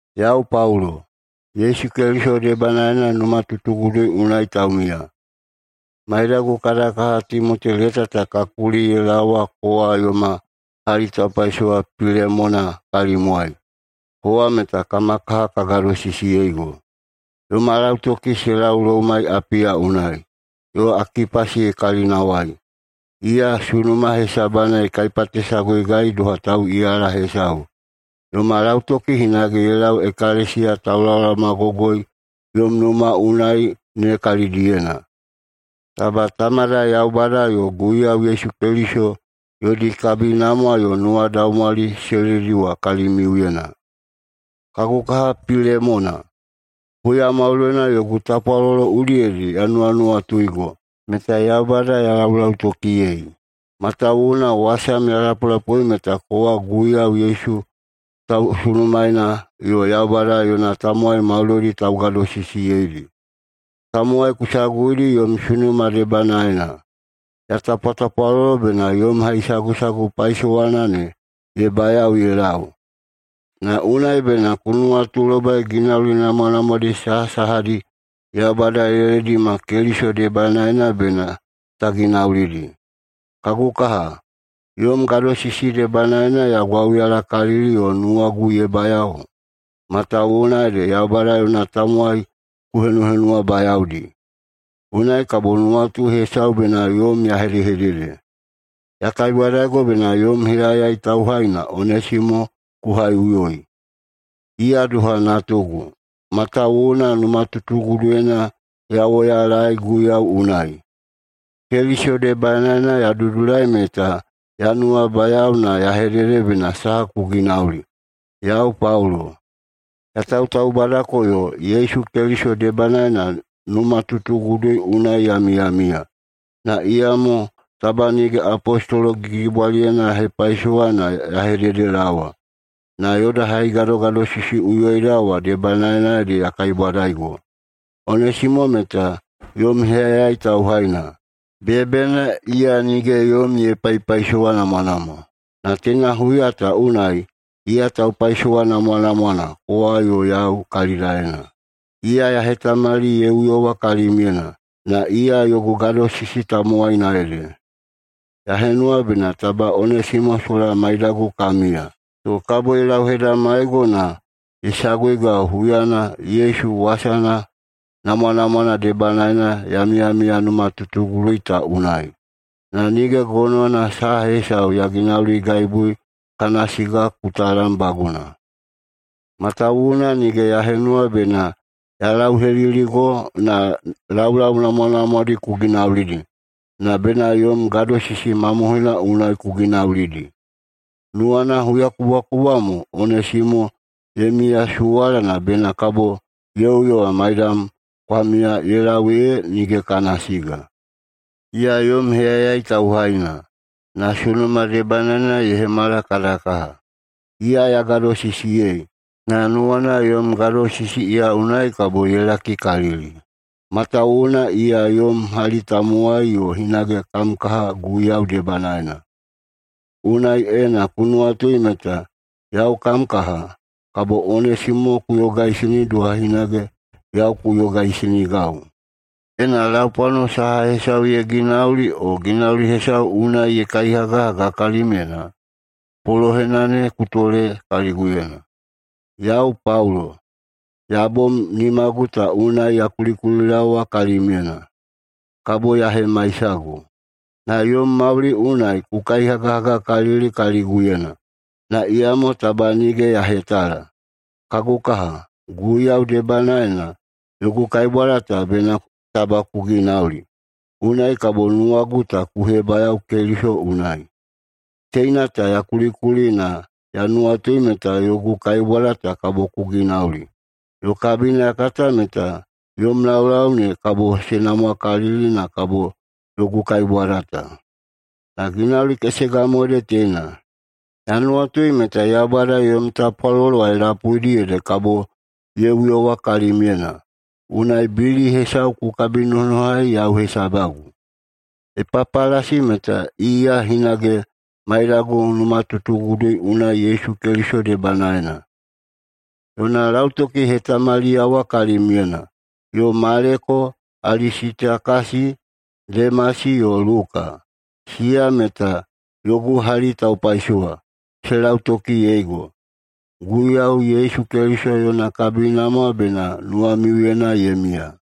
Yau Paulo, Yesu Keliso debanaena numatutugudu unai taumiya. Maidagu kada kaha Timoti leta ta ka kuli ye laowa kowa yoma hali taupaisowa Pilemona kalimwai. Kowa meta kama kaha ka gadosisiyeigo. Yoma lautoki se lau loumai Apiya unai, yo Akipasi kalinawai, iya sunuma hesabana ye kaipatesaguigai doha tauꞌiyala hesau. Yoma lautoki hinage ye lau ekalesiya taulaolaomagogoi yom numa unai ne kalidiyena. Taba Tamada Yaubada yo Guiyau Yesu Keliso yodi kabinamwa yo nuwadaumwali se lediwa kalimiuyena. Kagu kaha Pilemona, huya maudoina yogu tapwalolo udiyedi ya nuwanuwatuigo, meta Yaubada ya laulautokiyei, matawuwuna wasam ya lapulapui meta kowa Guiyau Yesu tausunumaena yo Yaubada yona tamowai maudoidi taugadosisiyeidi. Tamowai ku saguidi yom sunuma debanaena. Ya tapwatapwalolo bena yom haisagusagu paisowana ne ye bayao ye lau, na unai bena ku nuwatulobai ginauli namwanamwadi sahasahadi Yaubada ye ledima Keliso debanaena bena ta ginaulidi. Kagu kaha, yom gadosisi debanaena ya gwauyalakalili yo nuwagu ye bayao, matawuwuna ede Yaubada yona tamowai ku henuhenuwabayaodi. Unai kabo nuwatu hesau bena yom ya hedehedede. Ya kaibwadaigo bena yom heyayai tauhaina Onesimo ku haiꞌuyoi. Iya doha natugu, matawuwuna numatutuguduyena ya woyalaei Guiyau unai. Keliso debanaena ya dudulai meta ya nuwabayao na ya hedede bena saha ku ginauli, yau Paulo, ya tautaubadako yo Yesu Keliso debanaena numatutugudu unai ya miyamiya. Na iyamo taba nige apostolo gigibwalina ya hepaisowa na ya hededelaowa. Na yoda haigadogadosisiꞌuyoida wa debanaena ede ya kaibwadaigo. Onesimo meta yom heyayai tauhaina. Beyabeyana iya nige yom ye paipaisowanamwanamwa, na teina huya ta unai iya taupaisowa namwanamwana kowa yo yau kalidaena. Iya ya hetamali ye uyowa kalimyena, na iya yogu gadosisi tamowaina ede. Ya henuwa bena taba Onesimo sola maidagu ka miya, to kabo ye lauhedamaigo na ye saguigau huyana Yesu wasana namwanamwana debanaena ya miyamiya numatutugudu ta unai. Na nige gonowana saha hesau ya ginauligaibui kana siga ku talambaguna, matawuwuna nige ya henuwa bena ya lauheliligo na laulau namwanamwadi ku ginaulidi, na bena yom gadosisi mamohoina unai ku ginaulidi. Nuwana huyakubwakubwa mo Onesimo ye miyasuwala na bena kabo ye uyowa maidam kwa miya ye lau ee nige kana siga. Iya yom heyayai tauhaina, na sunuma debanaena ye hemala kada kaha. Iya ya gadosisiyei, na nuwana yom gadosisi iya unai kabo ye lakikalili, matawuwuna iya yom hali tamowai yo hinage kam kaha Guiyau debanaena. Unai, ena ku nuwatui meta yau kam kaha, kabo Onesimo ku yogaisini doha hinage yau ku yogaisinigau. Ena laupwano saha hesau ye ginauli o ginauli hesau unai ye kaihagahaga kalimyena, polohena ne ku tole kaliguyena. Yau Paulo, ya bom nimagu ta unai ya kulikulilaowa kalimyena: Kabo ya hemaisago. Na yom mauli unai ku kaihagahagakalili kaliguyena, na iyamo taba nige ya hetala. Kagu kaha, Guiyau debanaena yogu kaibwada ta bena taba ku ginauli. Unai kabo nuwagu ta ku hebayao Keliso unai. Teina ta ya kulikuli na ya nuwatui meta yogu kaibwada ta kabo ku ginauli, yo kabina ya kata meta yom laulau ne kabo se namwakalili na kabo yogu kaibwada ta. Na ginauli kesega mo ede teina: Ya nuwatui meta Yaubada yomi tapwalolo wa ye lapuidi ede kabo ya uyowa kalimiuyena. Unai bili hesau ku kabinonohai yau hesabagu. Epapalasi meta iya hinage maiyagu numatutugudu unai Yesu Keliso debanaena. Yona lautoki ye hetamaliyawa kalimyena. Yo Maleko, Alisitakasi, Demasi yo Luka, siya meta yogu hali taupaisowa, se lautokiyeigo. Guiyau Yesu Keliso yona kabinamwa bena nuwamiuyena ye miya.